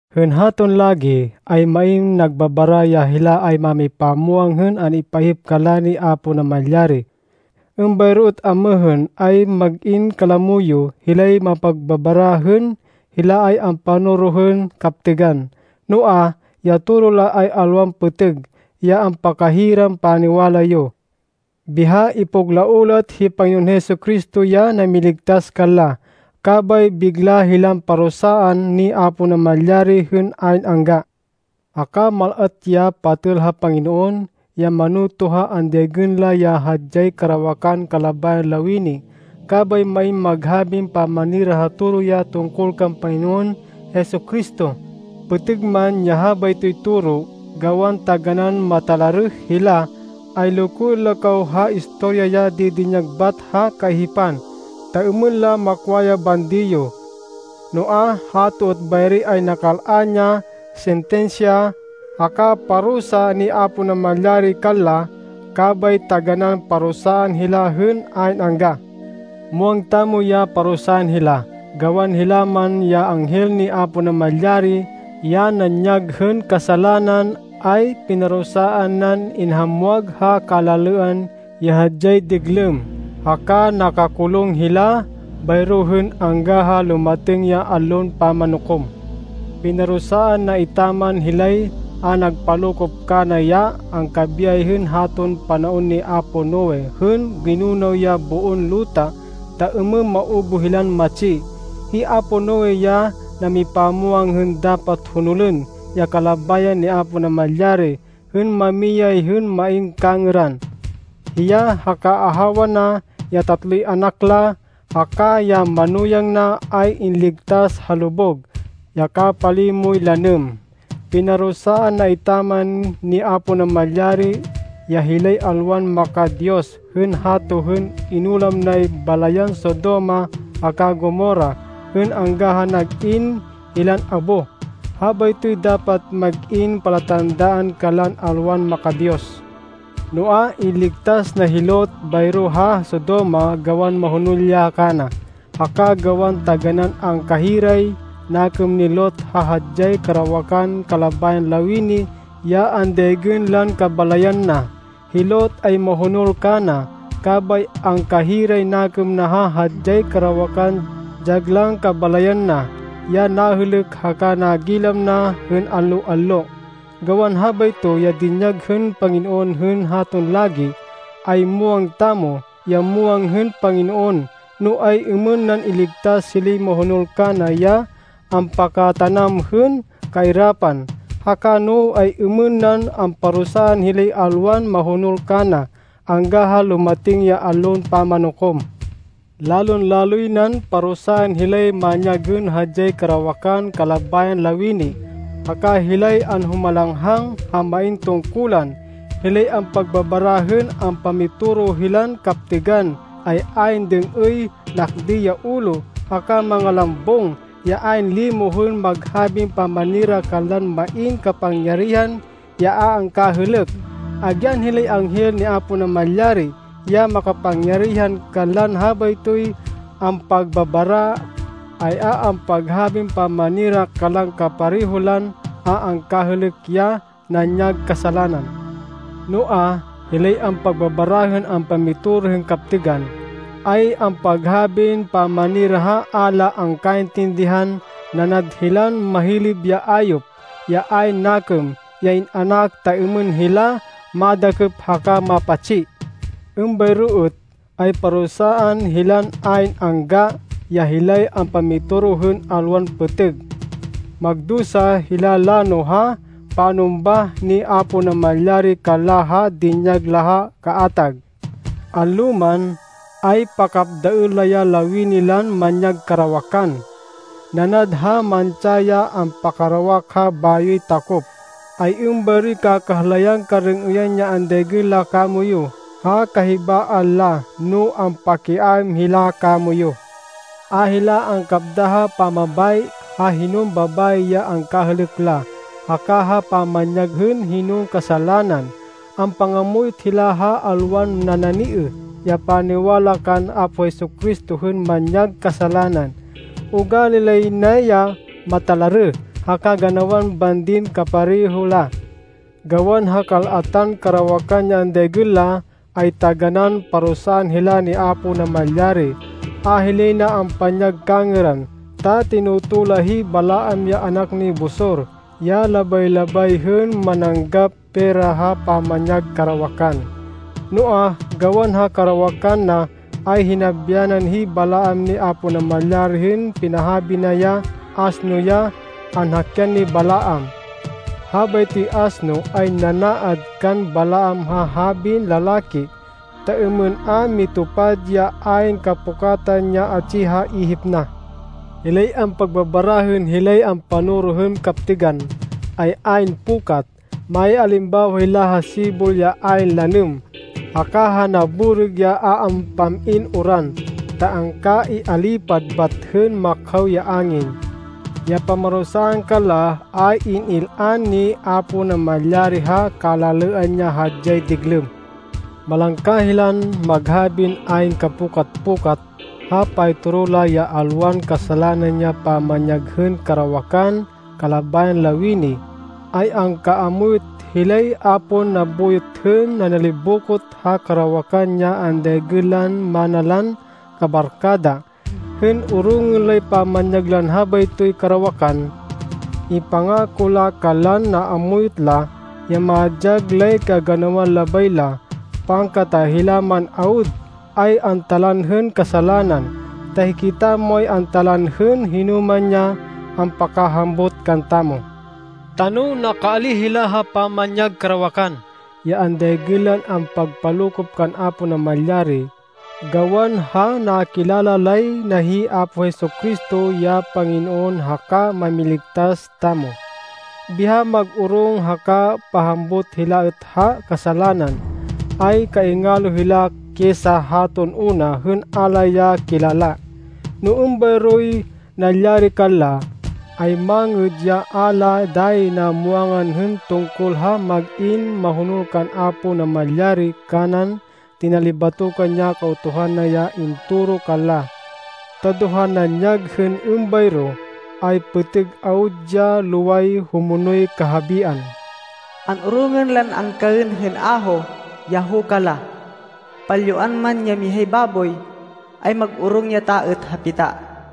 Hên haton lagi, ay main nagbabara ya hila ay mámipamwang hên an-ipaihip kanla ni Apo Namalyari. Êmbayro êt amêhên, ay mag-in kalamo yo, hilay ampagbabara hên hila ay ampanoro hên kaptêgan. Noa, ya toro la ay alwan pêtêg, ya ampakahiran paniwala yo. Biha ipuglaoh la êt hi Panginoon Jesu-Cristo ya namiligtas kanla. Kabay bigla hilan parusaan ni Apo Namalyari hên ayn angga. Haka mal-at ya patêl ha Panginoon ya manoto ha andaygên la ya hadyay karawakan kalabayan lawini, kabay main maghabin pamanira ha toro ya tungkol kan Panginoon Jesu-Cristo, pêtêg man ya habaytoy toro. Gawan taganán matalarêh hila, ay lokoên la kaw ha istorya ya didinyag bêngat ha kaihipan, ta êmên la makwa ya bandi yo. Noa, hato êt bayri ay nakal-an ya sintinsya haka parusa ni Apo Namalyari kanla, kabay taganán parusaan hila hên ayn angga. Muwang tamo ya parusaan hila, gawan hila man ya anghel ni Apo Namalyari ya nanyag hên kasalanan, ay pinarusaan nan inhamwag ha kalalêan ya hadyay diglêm. Haka nakakulung hila bayro hên angga ha lumatêng ya Allon Pamanukom. Pinarusaan na etaman hilay a nagpalokop kana ya angkabiyay hên haton panaon ni apo Noe hên ginunaw ya boon luta ta êmên maubuh hilan matsi. Hi apo Noe ya namipamwang hên dapat honolên ya kalabayan ni Apo Namalyari hên mamiyay hên main kangêran. Hiya haka ahawa na, ya tatloy anak la, haka ya manuyang na, ay inligtas ha lubug, ya kapalimoy lanêm. Pinarusaan na etaman ni Apo Namalyari ya hilay alwan maka-Diyos hên hato hên inulam nay balayan Sodoma haka Gomorra, hên angga ha nag-in hilan abo. Habaytoy dapat mag-in palatandaan kanlan alwan maka-Diyos. Noa, inligtas na hi Lot bayro ha Sodoma gawan mahonol ya kana, haka gawan taganán angkahiray nakêm ni Lot ha hadyay karawakan kalabayan lawini ya andaygên lan kabalayan na. Hi Lot ay mahonol kana, kabay angkahiray nakêm na ha hadyay karawakan dyag lan kabalayan na, ya nahêlêk haka nagilam na hên allo-allo. Gawan habayto ya dinyag hên Panginoon hên haton lagi, ay muwang tamo, ya muwang hên Panginoon, no ay-êmên nan iligtas hilay mahonol kana ya ampakatanam hên kairapan, haka no ay-êmên nan amparusaan hilay alwan mahonol kana, angga ha lumatêng ya Allon Pamanukom. Lalon-laloy nan parusaan hilay manyag hên hadyay karawakan kalabayan lawini, haka hilay anhumalanghang ha main tungkulan. Hilay ampagbabara hên ampamitoro hilan kaptêgan ay ayn dêng-êy, nakdêy ya ulo, haka mangalambung, ya ayn limo hên maghabin pamanira kanlan main kapangyarihan ya a angkahêlêk. Agyan hilay anghel ni Apo Namalyari ya makapangyarihan kanlan habaytoy ampagbabara, ay a ampaghabin pamanira kanlan kapareho lan a angkahêlêk ya nanyag kasalanan. Noa, hilay ampagbabara hên ampamitoro hên kaptêgan, ay ampaghabin pamanira ha a la angkaintindihan. Nanad hilan mahilêb ya ayop, ya ayn nakêm, ya in-anak ta êmên hila madakêp haka mapatsi. Êmbayro êt ay parusaan hilan ayn angga ya hilay ampamitoro hên alwan pêtêg. Magdusa hila lano ha panumbah ni Apo Namalyari kanla ha dinyag la ha kaatag. Allo man, ay pakapdaên la ya lawini lan manyag karawakan. Nanad ha mantsa ya ampakarawak ha bayoy takop, ay êmbayroy kakahlayan karêng-êyan ya andaygên la kamoyu ha kahibaan la no ampakiaêm hila kamoyu. A hila angkapda ha pamabayi ha hinon babayi ya angkahêlêk la, haka ha pamanyag hên hinon kasalanan. Ampangamuyot hila ha alwan nananiêh ya paniwala kan Apo Jesu-Cristo hên manyag kasalanan. Ugali lay na ya matalarêh ha kaganawan bandin kapareho la. Gawan ha kal-atan karawakan ya andaygên la, ay taganán parusaan hila ni Apo Namalyari. A hilay na ampanyag kangêran ta tinoto la hi Balaam ya anak ni Bosor ya labay-labay hên mananggap pera ha pamanyag karawakan. Noa, gawan ha karawakan na, ay hinabyanan hi Balaam ni Apo Namalyari hên pinahabi ya asno ya anhakyan ni Balaam. Habaytoy asno ay nanaad kan Balaam ha habin lalaki, ta êmên a mitupad ya ayn kapukatan ya atsi ha ihip na. Hilay ampagbabara hên hilay ampanoro hên kaptêgan, ay ayn pukat. Maialimbawa hila ha sibol ya ayn lanêm, haka ha naborêg ya a ampam-in uran, ta angkaialipad bat hên makhaw ya angin. Ya pamarusaan kanla, ay in-il-an ni Apo Namalyari ha kalalêan ya hadyay diglêm. Malangka hilan maghabin ayn kapukat-pukat. Ha paytoro la ya alwan kasalanan ya pamanyag hên karawakan kalabayan lawini, ay angkaamuyot hilay a pon nabuyot hên nanalibokot ha karawakan ya andaygên lan mana lan kabarkada, hên orongên lay pamanyag lan habaytoy karawakan. Ipangako la kanlan naamuyot la, ya madyag lay kaganawan labay la, pangkata hila man awud, ay antalanên hên kasalanan. Ta hikitamo ay antalanên hên hinoman ya ampakahambut kantamo. Ta no nakaalíh hila ha pamanyag karawakan ya andaygên lan a ampagpalokop kan Apo Namalyari, gawan ha nakilala lay na hi Apo Jesu-Cristo ya Panginoon haka Mámiligtas tamo, biha mag-orong haka pahambut hila êt ha kasalanan, ay kaingalo hila kisa haton una hên a la ya kilala. No êmbayroy nalyari kanla, ay mangêd ya a la dayi namwangan hên tungkol ha mag-in mahonol kan Apo Namalyari kanan tinalibatokan ya Kautuhan na ya intoro kanla. Ta do ha nanyag hên êmbayro, ay pêtêg awud ya loway humonol ya kahabian. “An-orongên lan angkaên hên aho ya huka la.” “Palyuan man ya mihay baboy, ay mag-orong ya ta êt ha pita.”